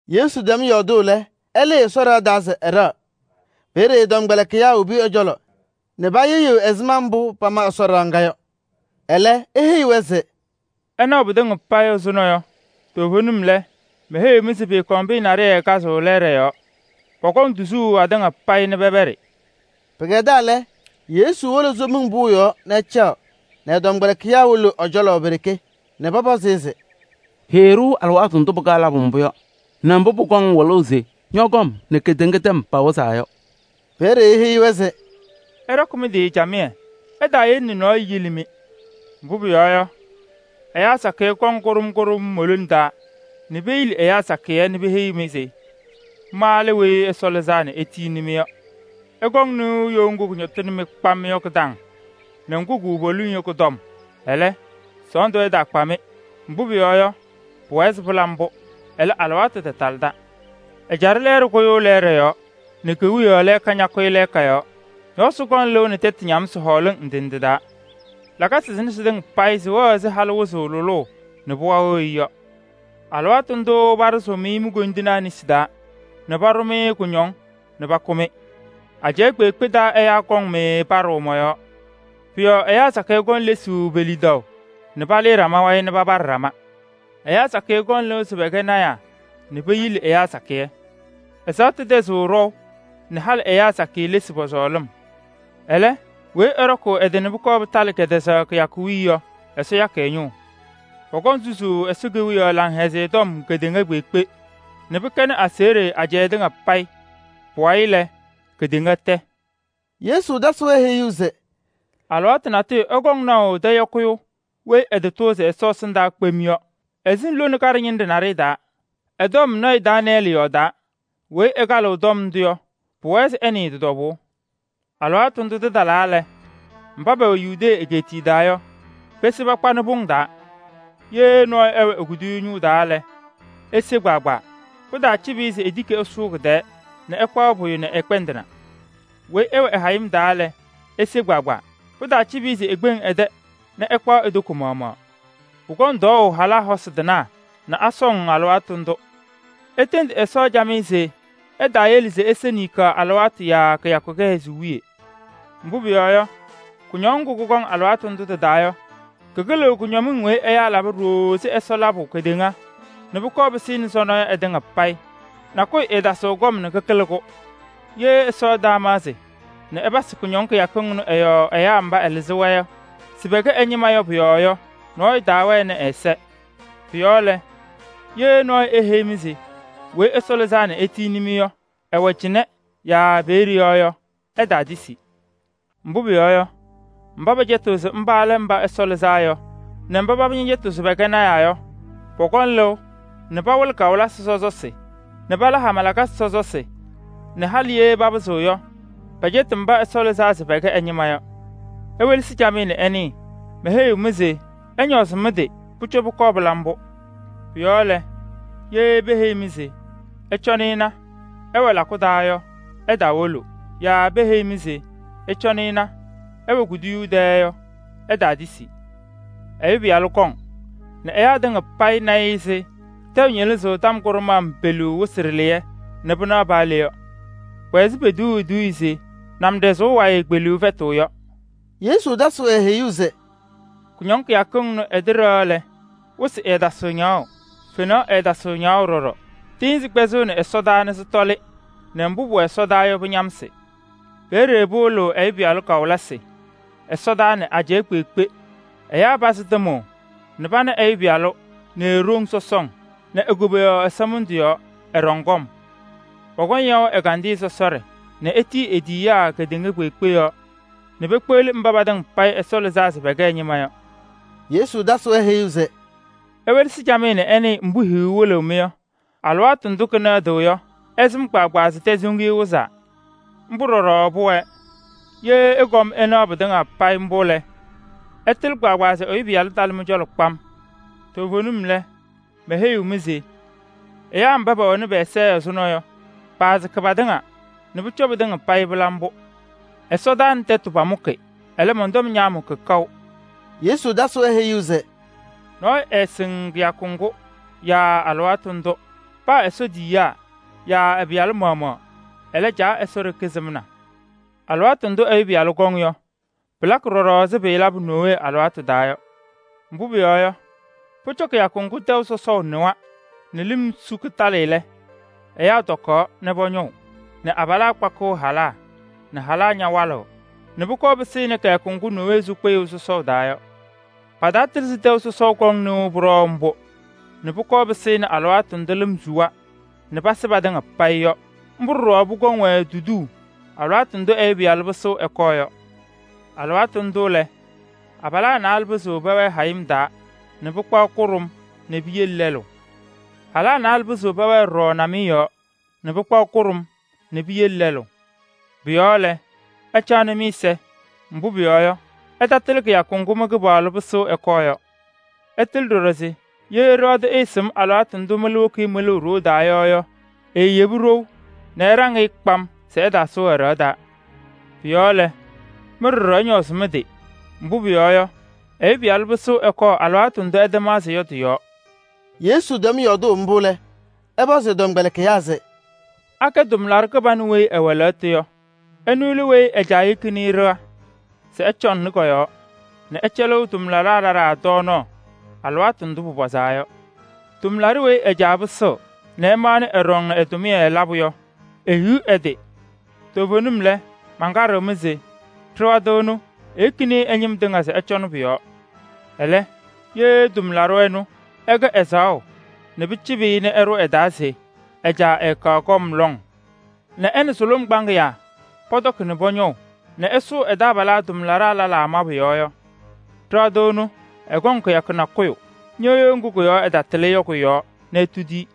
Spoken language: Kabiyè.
Yesu tɛm yɔɔdʋʋ lɛ, ɛlɩɩ Ɛsɔ ɖɩɣa taa se ɛɖɛɣ. Peeye ɛ-tɔmkpɛlɩkɩyaa wobi ɛ-cɔlɔ nɛ payɩɣyɩɣ ɛzɩma mbʋ pama Ɛsɔ ɖɩɣa ŋga yɔ. Ɛlɛ, eheyi-wɛ se: “Ɩnaɣʋ pɩtɩŋa payɩ ɛzʋnɔ yɔ, toovenim lɛ, meheyiɣ-mɩ se pɩɩkɔŋ pɩyɛ naɖɩyɛ kazʋʋ lɛɛɖɛ yɔɔ, pɔkɔŋ tuzuu atɩŋa payɩ nɛ pɛpɛɖɩ.” Pɩkɛdaa lɛ, Yesu wolo Somiŋ Pʋʋ yɔɔ nɛ ɛcaɣ nɛ ɛ-tɔmkpɛlɩkɩyaa wolo ɛ-cɔlɔ pe-ɖeke nɛ pɔpɔzɩ-ɩ se: “Heyi-ɖʋ alɩwaatʋ ndʋ pɩkaɣ labʋ mbʋ yɔ nɛ mbʋ pʋkɔŋ wɩlʋʋ se ñɔ-kɔm nɛ kedeŋa tɛm pawɩzaa yɔ.” Peeye eheyi-wɛ se: “Ɩɖɔkɩ mɩ-tɩ camɩyɛ, ɩtaayele nɛ nɔɔyʋ yili-mɩ. Mbʋ pʋyɔɔ yɔ, ɛyaa sakɩyɛ kɔŋ kʋɖʋm kʋɖʋm mo-lone taa nɛ peyili ɛyaa sakɩyɛ nɛ peheyi-mɩ se: ‘Ma lɛ Weyi Ɛsɔ Lɩzaa nɛ etiyini-mɩ’ yɔ. Ɩkɔŋ nɩʋ you ŋgʋ kʋñɔtɩnɩ-mɩ kpam yɔ kɩ-taŋ nɛ ŋgʋ kʋwɛ poliŋ yɔ kʋ-tɔm. Ɛlɛ, sɔɔndʋ ɛtaakpa-mɩ, mbʋ pʋyɔɔ yɔ, pʋwɛɛ se pɩla mbʋ. Ɛlɛ, alɩwaatʋ tatalɩda. Ɛjaɖɛ lɛɛɖɛ kʋyʋʋ lɛɛɖɛ yɔɔ nɛ kewiyaɣ lɛɛka ñakʋyɩ lɛɛka yɔɔ. Ñɔɔsɩ kɔŋ lɩʋ nɛ tɛtʋ ñamsɩ hɔɔlɩŋ ndɩ ndɩ taa. Lakasɩ sɩnɛ sɩtɩŋa payɩ sɩwɛɣ ɛzɩ halʋ wɩzʋʋ lʋlʋʋ nɛ pɩɣa wɩɣ-ɩ yɔ. “Alɩwaatʋ ndʋʋ paɖʋzʋʋ-mɩ mi-koyindinaa nesi taa nɛ paɖʋ-mɩ kʋñɔŋ nɛ pakʋ-mɩ. Ajɛɛ kpeekpe taa ɛyaa kɔŋ-mɩ paɖʋʋ mɔ-yɔɔ. Pʋ-yɔɔ ɛyaa sakɩyɛ kɔŋ lesuu pe-lidaʋ nɛ pokuli ɖama wayɩ nɛ papaɖɩ ɖama. Ɛyaa sakɩyɛ kɔŋ lɩʋ se pɛkɛ lɔɔyɩsɩ tɩnaa nɛ peyili ɛyaa sakɩyɛ. Ɛzaɣtʋ tɛzɩɣ ɖɔʋ nɛ halɩ ɛyaa sakɩyɛ lesi pɔ-sɔɔlɩm. Ɛlɛ, weyi ɛɖɔkʋʋ ɛ-tɩ nɛ pʋkɔɔ pɩtalɩ kɛtɛzaɣ kɩyakʋ wiye yɔ, Ɛsɔ yakɩ ɛ-ñʋʋ. Pɔkɔŋ susuu Ɛsɔ Kewiyaɣ Laŋhɛzɩyɛ Tɔm kedeŋa kpeekpe nɛ pɩkɛnɩ aseɣɖe ajɛɛ tɩŋa payɩ. Pʋwayɩ lɛ, kedeŋa tɛ.” Yesu tasɩ-wɛ heyuu se: “Alɩwaatʋ natʋyʋ ɩkɔŋ naʋ tɛyɔkɩyʋ weyi ɛtatʋʋzɩ Ɛsɔ ɛsɩndaa kpem yɔ, ɛsɩŋ lone kaɖɛ ñɩnɖɛ taa. Ɛ-tɔm lɔɔyaɣ tʋ Daanɩyɛɛlɩ yɔɔdaa. Weyi ɛkalɩɣ tɔm ndʋ yɔ, pʋwɛɛ se ɛnɩɩ tɩ-tɔbʋʋ. Alɩwaatʋ ndʋ tɩtalaa lɛ, mba pɛwɛ Yudee egeetiye taa yɔ, pese pakpanɩ pʋŋ taa. Ye nɔɔyʋ ɛwɛ e-kuduyuu ñʋʋ taa lɛ, ese kpaagbaa. Pɩtaacɩbɩ-ɩ se etiki ɛsʋʋ kɩ-tɛɛ nɛ ɛkpaɣ pʋyʋ nɛ ɛkpɛndɩna. Weyi ɛwɛ hayɩm taa lɛ, ese kpaagbaa. Pɩtaacɩbɩ-ɩ se ekpeŋ ɛ-tɛ nɛ ɛkpaɣ e-toko maɣmaɣ. Pʋkɔŋ tɔɔʋ halaa hosi tɩnaa nɛ asɔŋ alɩwaatʋ ndʋ! Itendi Ɛsɔ camɩyɛ se ɛtaayele se ise ninkaɣ alɩwaatʋ yaa kɩyakʋ kɩhɛzʋʋ wiye. Mbʋ pʋyɔɔ yɔ, kʋñɔŋ ŋgʋ kʋkɔŋ alɩwaatʋ ndʋ tɩ-taa yɔ, kɩkɩlɩɣ kʋñɔmɩŋ weyi ɛyaa laba ɖooo ɛzɩ Ɛsɔ labʋ kedeŋa nɛ pʋkɔɔ pɩsɩnɩ sɔnɔ yɔ ɩtɩŋa payɩ. Nakʋyʋ ɛɛtasɩɣ kɔm nɛ kɩkɩlɩ-kʋ. Ye Ɛsɔ ɛtaamaɣzɩ nɛ ɛpasɩ kʋñɔŋ kɩyakɩŋ ɩnʋ ɩ-yɔɔ ɛyaa mba ɛlɩzɩ-wɛ se pɛkɛ ɛ-ñɩma yɔ pɔ-yɔɔ yɔ, nɔɔyʋ taawɛnɩ ɛ-ɛza. “Pʋ-yɔɔ lɛ, ye nɔɔyʋ eheyi-mɩ se Weyi Ɛsɔ Lɩzaa nɛ etiyini-mɩ yɔ, ɛwɛ cɩnɛ yaa peeye yɔ yɔ, ɩtaatisi. Mbʋ pʋyɔɔ yɔ, mba pɛcɛtɩɣ se mba lɛ Mba Ɛsɔ Lɩzaa Yɔ nɛ mba paba ñɛcɛtɩɣ se pɛkɛ lɔɔyɩsɩ tɩnaa yɔ, pɔkɔŋ lɩʋ nɛ pawɩlɩ kawɩlɩsɩ sɔsɔsɩ nɛ pala hama lakasɩ sɔsɔsɩ nɛ halɩ ye papɩzɩɣ yɔ, pɛcɛtɩ mba Ɛsɔ lɩzaa se pɛkɛ ɛ-ñɩma yɔ. Iwelesi camɩyɛ nɛ ɩnɩɩ, meheyi-mɩ se pʋcɔ pʋkɔɔ pɩla mbʋ. “Pʋ-yɔɔ lɛ, ye peheyi-mɩ se: ‘Ɩcɔnɩ ɩna, ɛwɛ lakʋ taa’ yɔ, ɩtaawolo. Yaa peheyi-mɩ se: ‘Ɩcɔnɩ ɩna, ɛwɛ kuduyuu tɛɛ’ yɔ, ɩtaatisi. Ɛyʋ Pɩyalʋ kɔŋ nɛ ɛyaa tɩŋa payɩ na-ɩ ɛzɩ tɛʋ ñɩlɩzʋʋ tɔm kʋɖʋm peleu wɩsɩ ɖɩlɩyɛ nɛ pɩnaɣ paa le yɔ. Pʋwɛ ɛzɩ potuuu eduuye se: ‘Namɖazʋʋ wayɩ kpeliŋ fɛtɩɣ’ yɔ.” Yesu tasɩ-wɛ heyuu se: “Kʋñɔŋ kɩyakɩŋ ɩnʋ ɩtɩɖɛɣ lɛ, wɩsɩ ɛɛtasɩɣ ñaɣʋ, fenaɣ ɛɛtasɩɣ ñaɣʋ ɖɔɖɔ. Tɩɩnzɩ kpɛzɩɣnɩ ɛsɔdaa nɛ sɩtɔlɩ nɛ mbʋ pʋwɛ ɛsɔdaa yɔ, pɩñamsɩ. Peeye pɩwɩlɩɣ Ɛyʋ Pɩyalʋ kawɩlɩsɩ ɛsɔdaa nɛ ajɛɛ kpeekpe ɛyaa pazɩ tɩmʋʋ nɛ pana Ɛyʋ Pɩyalʋ nɛ e-ɖoŋ sɔsɔŋ nɛ e-koboyaɣ ɛsɔmɩndʋ yɔɔ, ɛɖɔŋ kɔm. Pɔkɔŋ yaʋ ɛgandɩyɛ sɔsɔɖɛ nɛ etiyi e-tiyiyaa kedeŋa kpeekpe yɔɔ nɛ pekpeɣli mba patɩŋa payɩ Ɛsɔ lɩzaa se pɛkɛ ɛ-ñɩma yɔ.” Yesu tasɩ-wɛ heyuu se: “Iwelesi camɩyɛ nɛ ɩnɩɩ mbʋ hiyuu wɩlɩɣ-mɩ yɔ: alɩwaatʋ ndʋ kɩnɛɣdɩɣ yɔ, ɩsɩm kpaagbaa se tɛsoŋiye wɩzaa. Mbʋ ɖɔɖɔ pʋwɛɛ. Ye ɩkɔm ɩnaɣ pɩtɩŋa payɩ mbʋ lɛ, ɩtɩlɩ kpaagbaa se Ɛyʋ Pɩyalʋ talɩ mɩ-cɔlɔ kpam. Toovenim lɛ, meheyiɣ-mɩ se: ɛyaa mba pɛwɛnɩ pɛ-ɛza ɛzʋnɔ yɔ, paasɩkɩ patɩŋa nɛ pʋcɔ pɩtɩŋa payɩ pɩla mbʋ. Ɛsɔtɔnʋʋ nɛ tɛtʋ pamʋkɩ, ɛlɛ, mɔn-tɔm ñaamʋkɩ kaʋ.” Yesu tasɩ-wɛ heyuu se: “Nɔɔyʋ ɛɛsɩŋ kɩyakʋ ŋgʋ yaa alɩwaatʋ ndʋ. Paa Ɛsɔ tiyiyaa yaa ɛ-Pɩyalʋ maɣmaɣ. Ɛlɛ, Caa Ɛsɔ ɖeke sɩmna. Alɩwaatʋ ndʋ Ɛyʋ Pɩyalʋ kɔŋ yɔ, pɩlakɩ ɖɔɖɔ ɛzɩ pɩɩlabʋ Nowee alɩwaatʋ taa yɔ. Mbʋ pʋyɔɔ yɔ, pʋcɔ kɩyakʋ ŋgʋ tɛʋ sɔsɔʋ nɩwa nɛ lɩm su yɔ kɩtalɩ lɛ, ɛyaa tɔkaɣ nɛ pɔñɔʋ nɛ abalaa kpakɩɣ halaa nɛ halaa ñawalɩɣ nɛ pʋkɔɔ pɩsɩnɩ kɩyakʋ ŋgʋ Nowee sʋ kpɩyʋʋ sɔsɔʋ taa yɔ. Pataatɩlɩ se tɛʋ kɔŋ nɩʋ sɔsɔm mbʋ nɛ pʋkɔɔ pɩsɩnɩ alɩwaatʋ ndʋ lɩm suwa nɛ pasɩ patɩŋa payɩ yɔ. Mbʋ ɖɔɖɔ pʋkɔŋ-wɛ tuduu alɩwaatʋ ndʋ Ɛyʋ Pɩyalʋ kitiɣ ɛkɔɔ yɔ. Alɩwaatʋ ndʋ lɛ, abalaa naalɛ pɩzɩɣ pɛwɛɛ hayɩm taa nɛ pɩkpaɣ kʋɖʋm nɛ piyele lɛlʋ. Halaa naalɛ pɩzɩɣ pɛwɛɛ ɖɔɖɔ namɩyɛ yɔɔ nɛ pɩkpaɣ kʋɖʋm nɛ piyele lɛlʋ. Pʋ-yɔɔ lɛ, ɩcaɣnɩ mɩ-ɛza, mbʋ pʋyɔɔ yɔ, ɩtatɩlɩ kɩyakʋ ŋgʋ mɩ-Kɩpaɣlʋ pɩsɩɣ ɛkɔɔ yɔ. Ɩtɩlɩ ɖɔɖɔ se ye ɖɩɣa tʋ ɛɛsɩm alɩwaatʋ ndʋ mɩlʋ woki-i mɩlʋʋ ɖoo taa yɔ yɔ, eeyebi ɖou nɛ ɛɖaŋ-ɩ kpam se ɛtaasʋʋ ɛ-ɖɩɣa taa. Pʋ-yɔɔ lɛ, mɩ ɖɔɖɔ ɩñɔɔzɩ mɩ-tɩ, mbʋ pʋyɔɔ yɔ, Ɛyʋ Pɩyalʋ pɩsɩɣ ɛkɔɔ alɩwaatʋ ndʋ ɩtamaɣzɩ yɔ tɩ-yɔɔ.” Yesu tɛm yɔɔdʋʋ mbʋ lɛ, ɛpɔzɩ ɛ-tɔmkpɛlɩkɩyaa se: “Akɛ tʋmlaɖʋ kɩbanʋ weyi ɛwɛ lɛɣtʋ yɔ? Ɛnʋ lɛ weyi ɛ-caa yekini-i ɖɩɣa se ɛcɔŋnɩ kɔ-yɔɔ nɛ ɛcɛlɩɣ tʋmlaɖaa lɛlaa tɔɔnaɣ alɩwaatʋ ndʋ pʋmʋnaa yɔ. Tʋmlaɖʋ weyi ɛ-caa pɩsɩɣ nɛ ɛmaɣnɩ ɛɖɔŋ ɛ-tʋmɩyɛ labʋ yɔ, ehiɣ ɛ-tɩ! Toovenim lɛ, mankaɖɩɣ-mɩ se: ɖɩɣa tʋ ɛnʋ, eyekini-i ɛ-ñɩm tɩŋa se ɛcɔnɩ pʋ-yɔɔ. Ɛlɛ, ye tʋmlaɖʋ ɛnʋ ɛkɛ ɛzaɣʋ nɛ pɩcɩbɩ-ɩ nɛ ɛɖʋ ɛ-taa se ɛ-caa ɛɛkaɣ kɔm lɔŋ nɛ ɛ nɛ sʋlʋm kpaŋɩyaa pɔtɔkɩ nɛ pɔñɔʋ nɛ ɛsʋʋ ɛ-taabalaa tʋmlaɖaa lɛlaa mabʋ yɔɔ yɔ, ɖɩɣa tʋ ɛnʋ, ɛkɔŋ kɩyakʋ nakʋyʋ ñɩɣyʋʋ ŋgʋ ɛtatɩlɩ yɔ kʋ-yɔɔ nɛ etudi-i